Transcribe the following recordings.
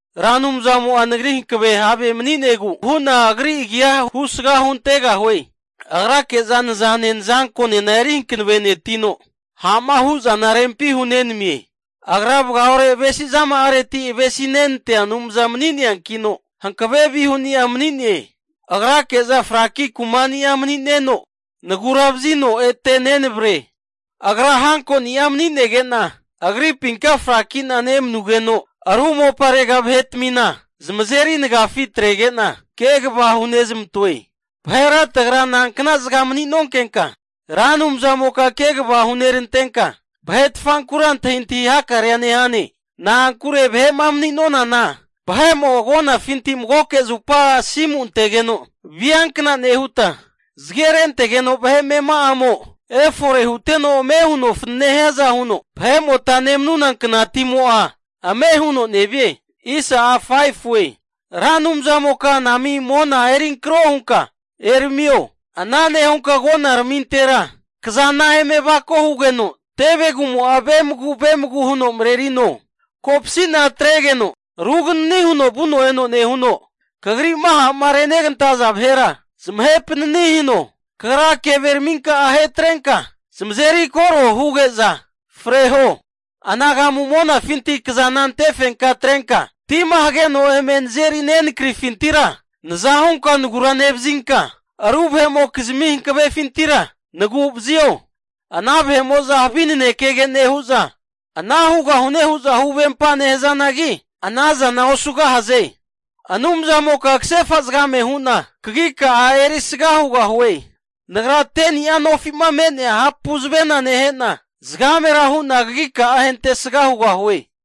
Ra Anumzamo'a nagri hankave have mani'negu hu'na Agri agi'a husga huntegahue. Agrake'za nazane nazankonena eri hankavenetino, ha'ma hu'zana rempi hunenamie. Agra vagaore avesizama'areti avesinenantea Anumza mani'neankino, hankave vihuni'a mani'ne. Agrake'za fraki kumani'a mani'neno, nagura'vazino ete nenavre. Agra hankoni'a mani'negena, agripinka fraki'na nemanugeno, ru moparega vahetamina zamazeri nagafi atrege'na kegava hunezamantoe. Vahera tagra nankna zaga mani'nonkenka, Ra Anumzamoka kegava hunerantenka, vahetfankura antahintahi hakarea nehane? Na'ankure vahe'ma mani'nonana, vahe'mo agonafinti magoke zupa asimu antegeno viankna nehuta, zage rentegeno vahe amema'amo efore huteno ame huno fanane hiaza huno vahe'mota nemanuna knatimo'a ame' huno nevie. Ra Anumzamoka anami mona eri ankro hunka eramio. Ana nehunka agonaramintera kazana eme avako hugeno tevegumo'a vemagu vemagu huno marerino. Kopasi'na atregeno ruganani huno vuno eno nehuno, Kagri'ma ha'ma renegantaza vahera zamahe panani hino. Kagra keveraminka'a ahetrenka zamazeri koro huge'za freho. Anagamu monafinkati kazana antefenka atrenka, tima hageno eme nazeri nenakrifintira naza hunka nagura nevazinka, ru vahe'mokizmi hankavefintira nagu'vazio. Ana vahe'mo'za havi nanekege nehu'za, ana hugahune hu'za huvempa nehazanagi, ana zana osugahaze. Anumzamoka kasefa zagame hu'na kagika'a erisga hugahue. Nagra 10ni'a nofi'ma me'nea hapu zavena nehe'na, zagamera hu'na kagika'a ahentesga hugahue.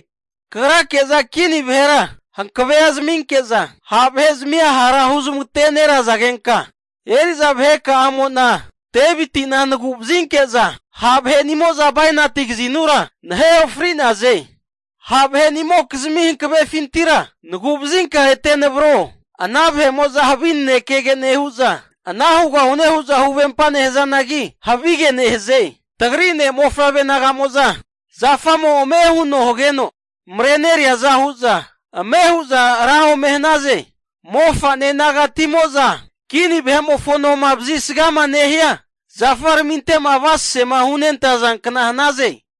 Kagrake'za kini vahera hankavea zaminke'za, ha' vahe'zamia hara huzamagate nerazagenka, eri'za vaheka'amo'na Deviti'na nagu'vazinke'za ha' vahe'nimo'za bainati kazinura nahe ofri'naze. Ha' vahenimokizmi hankavefintira nagu'vazinka ete navro. Ana vahe'mo'za havi nanekege nehu'za, ana hugahune hu'za huvempa nehazanagi, havige nehaze. Tagri ne' mofavre naga'mo'za zafamo ame huno hageno mareneriaza hu'za, ame hu'za ra ome hanaze. Mofa'ne nagatimo'za kini vahe'mofo noma vazisgama nehia zafaraminte'ma avasasema hunentaza kna hanaze.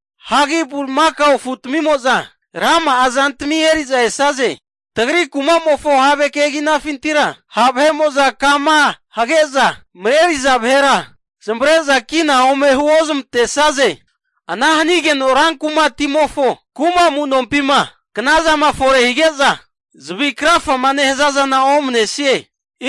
Hagi bulimakao afutimo'za rama'a zantmi eri'za esaze. Tagri kumamofo have keginafintira ha' vahe'mo'za kama hage'za mareriza vahera zamavare'za kina ome huozmantesaze. Ana hanigeno ran kumatimofo kuma amunompima, knazama fore hige'za zavi krafama nehaza zana omanesie.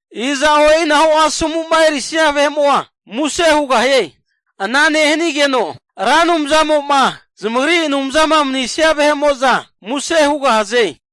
Iza'o e'inahu asomu'ma erisania vahe'mo'a muse hugahie. Ana nehanigeno Ra Anumzamo'ma zamagri Anumzama manisia vahe'mo'za muse hugahaze.